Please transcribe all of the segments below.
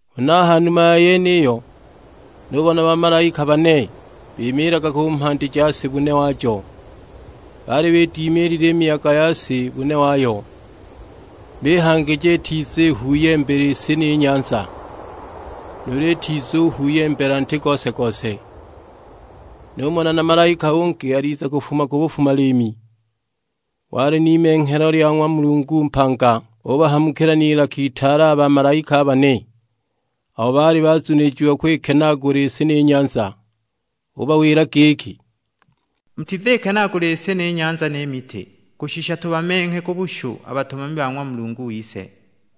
Huna a ha numa ya yeniyo nubona bamalaika bane bimiilaga ku mhandi ja si bune wajo. Baali bidimiilile i miyaga ya si bune wayo, bihangija itizihuuyembela i si ni nyanza; nuulu itizuhuuyembela nti gose-gose. Numona na malaika ungi aliza kufuma ku bufuma-liimi, wali n'imenghelo lya ng'wa Mulungu mpanga; ubahamukila n'ilaka itaale a bamalaika a bane, abo baali bazunilijiwa kwikenaagula i si ni nyanza. Ubawila giki, "Mutizikenaagula i si ni nyanza ni miti; kushisha tubamenghe ku bushu a batumami ba ng'wa Mulungu wise!"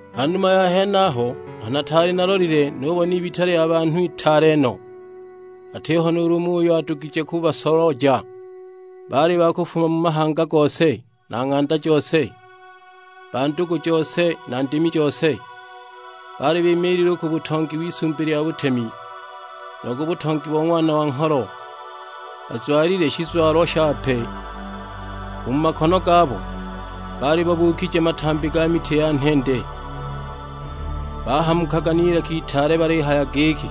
Ha numa ya henaho, aho nataali nalolile nubona ibita lya banhu itaale no, atiho nuulu umo uyo adugije kubasolooja; baali ba kufuma mu mahanga gose, na ng'anda jose, ba ndugu jose na ndimi jose. Baali bimiilile u ku butongi w'Isumbi lya butemi, nu ku butongi bo Ng'wana wa Ngholo, bazwalile shizwalo shape. U mu makono gabo baali babuukije matambi ga miti ya nhende. Bahamukaga n'ilaka itaale balihaya giki,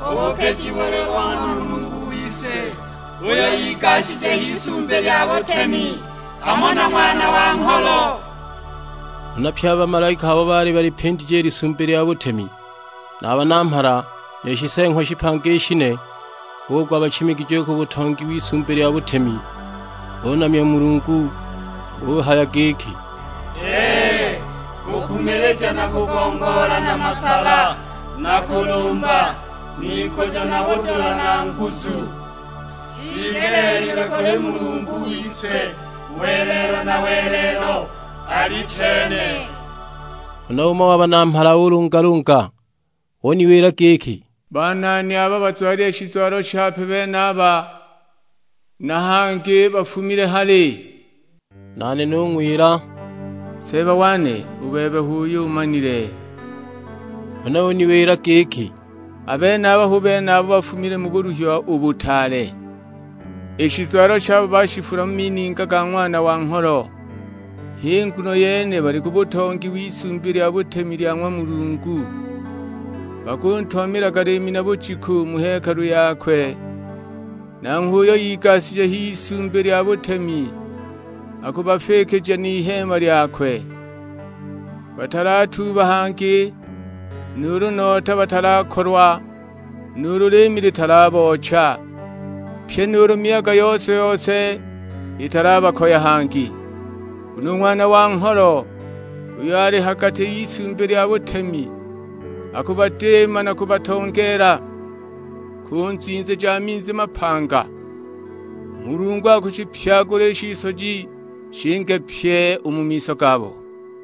"U bupiji buli bo ng'wa Mulungu wise uyo igashije h'Isumbi lya butemi; hamo na Ng'wana wa Ngholo." Huna pye a bamalaika abo baali balipindije i Lisumbi lya butemi, na a Banamhala ni Shiseeng'wa shipanga i shine, bugwa bachimigije u ku butongi w'Isumbi lya butemi, bunamya u Mulungu. Buhaya giki, "Ee, kukumilija na kugongoola na masala na kulumba, n'ikujo na budula na nguzu; shiigeleelilwe kuli Mulungu wise welelo na welelo: Alichene!" Huna umo wa Banamhala ulungalunga; uniwila giki, "Banani abo bazwalile shizwalo shape benaba, na hangi bafumile hali?" Nane nung'wila, "Seeba wane; u bebe h'uyo umanile!" Huna uniwila giki, "A benaba hu bene abo bafumile mu buluhiwa u butaale; i shizwalo shabo baashifula mu mininga ga Ng'wana wa Ngholo. H'i nguno yene bali ku butongi w'Isumbi lya butemi lya ng'wa Mulungu, bakuntumamilaga liimi na bujiku mu hekalu yakwe. Nanghwe uyo igashije h'Isumbi lya butemi akubafiikija n'iheema lyakwe. Batalatuuba hangi, nuulu nota batalakolwa, nuulu liimi litalaboocha, pyi nuulu miyaga yose-yose italabakoya hangi. Nguno u Ng'wana wa Ngholo uyo ali ha gati y'Isumbi lya butemi, akubadiima na kubatongeela ku nzwinzi ja minzi mapanga. U Mulungu akushipyagula i shisoji shinge pyi u mu miso gabo."